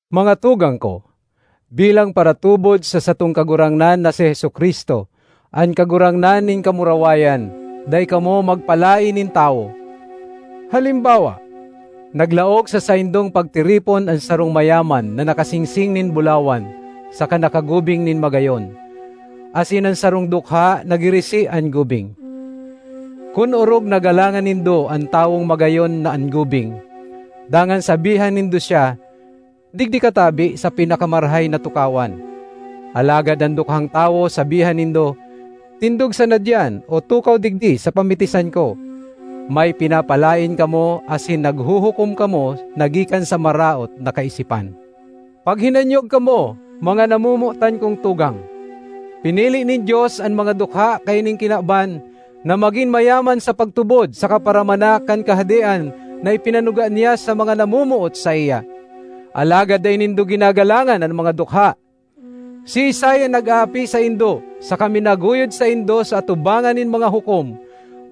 Mga tugang ko, bilang paratubod sa satong Kagurangnan na si Jesu-Cristo, an Kagurangnan nin kamurawayan, dai kamo magpalaen nin tawo. Halimbawa naglaog sa saindong pagtiripon an sarong mayaman na nakasingsing nin bulawan saka nakagubing nin magayon, asin an sarong dukha na girisi an gubing. Kun orog na galangan nindo an tawong magayon an gubing, dangan sabihan nindo siya, “Digdi ka tabi sa pinakamarahay na tukawan,” alagad an dukhang tawo sabihan nindo, “tindog sana diyan, o tukaw digdi sa pamitisan ko,” may pinapalaen kamo asin naghuhukom kamo na gikan sa maraot na kaisipan. Paghinanyog kamo, mga namomotan kong tugang! Pinili nin Dios an mga dukha kaining kinaban na magin mayaman sa pagtubod saka paramana kan kahadean na ipinanuga niya sa mga namomoot saiya. Alagad dai nindo ginagalangan an mga dukha! Siisay an nag-aapi saindo saka minaguyod saindo sa atubangan nin mga hukom?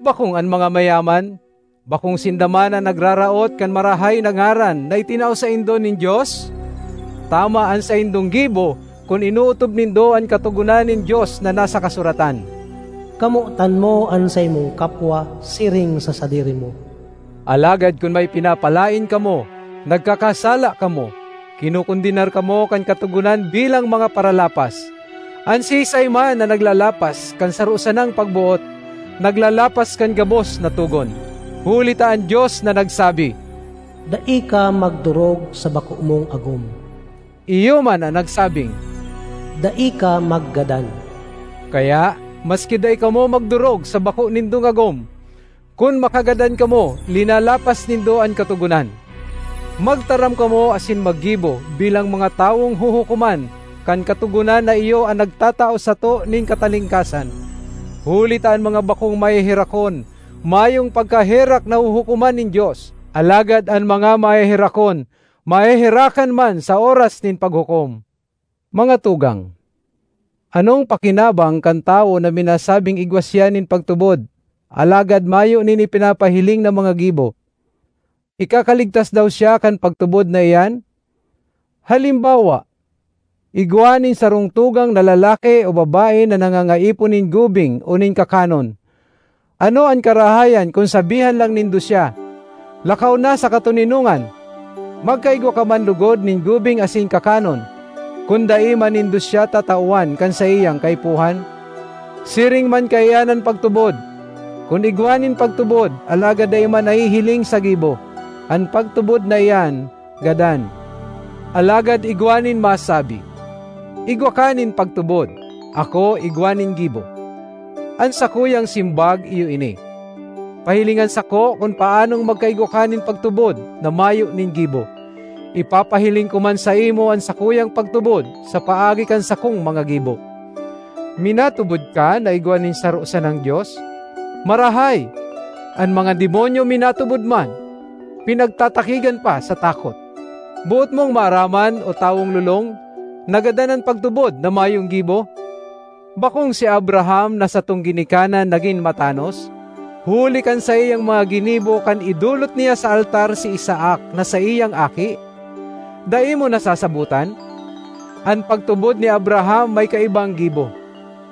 Bakong an mga mayaman? Bakong sinda man an nagraraot kan marahay na ngaran na itinao saindo nin Dios? Tama an saindong gibo kun inootob nindo an katogonan nin Dios na nasa kasuratan, “Kamotan mo an saimong kapwa siring sa sadiri mo.” Alagad kun may pinapalaen kamo, nagkakasala kamo; kinokondenar kamo kan Katogonan bilang mga paralapas. An siisay man na naglalapas kan saro sanang pagboot, naglalapas kan gabos na togon. Huli ta an Dios na nagsabi, “Dai ka magdorog sa bako mong agom,” iyo man an nagsabing, “Dai ka maggadan.” Kaya maski dai kamo magdorog sa bako nindong agom, kun makagadan kamo, linalapas nindo an Katogonan. Magtaram kamo asin maggibo bilang mga tawong huhukoman kan katogonan na iyo an nagtatao sato nin katalingkasan. Huli ta an mga bakong maheherakon, mayong pagkaherak na huhukoman nin Dios; alagad an mga maheherakon, maheherakan man sa oras nin paghukom. Mga tugang, anong pakinaban(g) kan tawo na minasabing igwa siya nin pagtubod, alagad mayo nin ipinapahiling na mga gibo? Ikakaligtas daw siya kan pagtubod na iyan? Halimbawa igwa nin sarong tugang na lalaki o babae na nangangaipo nin gubing o nin kakanon. Ano an karahayan kun sabihan lang nindo siya, “Lakaw na sa katoninongan! Magkaigwa ka man logod nin gubing asin kakanon,” kun dai man nindo siya tatawan kan saiyang kaipuhan? Siring man kaiyan an pagtubod: kun igwa nin pagtubod alagad dai man nahihiling sa gibo, an pagtubod na iyan gadan. Alagad igwa nin masabi, “Igwa ka nin pagtubod; ako igwa nin gibo.” An sakuyang simbag iyo ini: “Pahilingan sako kun paanong magkaigwa ka nin pagtubod na mayo nin gibo; ipapahiling ko man saimo an sakuyang pagtubod sa paagi kan sakong mga gibo.” Minatubod ka na igwa nin saro sanang Dios? Marahay! An mga demonyo minatubod man—pinagtatakigan pa sa takot. Boot mong maaraman, o tawong lolong, na gadan an pagtubod na mayong gibo? Bakong si Abraham na satong ginikanan nagin matanos, huli kan saiyang mga ginibo, kan idolot niya sa altar si Isaac na saiyang aki? Dai mo nasasabotan? An pagtubod ni Abraham may kaibang gibo;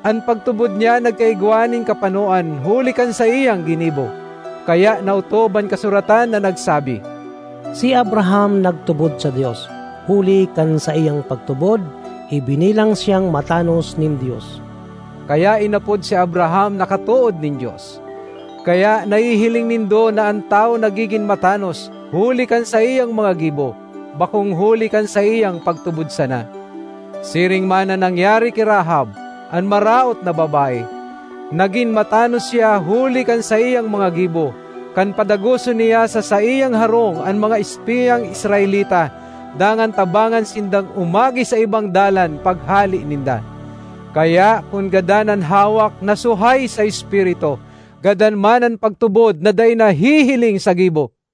an pagtubod niya nagkaigwa nin kapanoan huli kan saiyang ginibo. Kaya naotob an kasuratan na nagsabi, “Si Abraham nagtubod sa Dios; huli kan saiyang pagtubod ibinilang siyang matanos nin Dios.” Kaya inapod si Abraham na katood nin Dios. Kaya nahihiling nindo na an tawo nagigin matanos huli kan saiyang mga gibo, bakong huli kan saiyang pagtubod sana. Siring man an nangyari ki Rahab, an maraot na babae. Nagin matanos siya huli kan saiyang mga gibo, kan padagoson niya sa saiyang harong an mga espiyang Israelita dangan tabangan sindang umagi sa ibang dalan paghale ninda. Kaya kun gadan an hawak na suhay sa espiritu, gadan man an pagtubod na dai nahihiling sa gibo.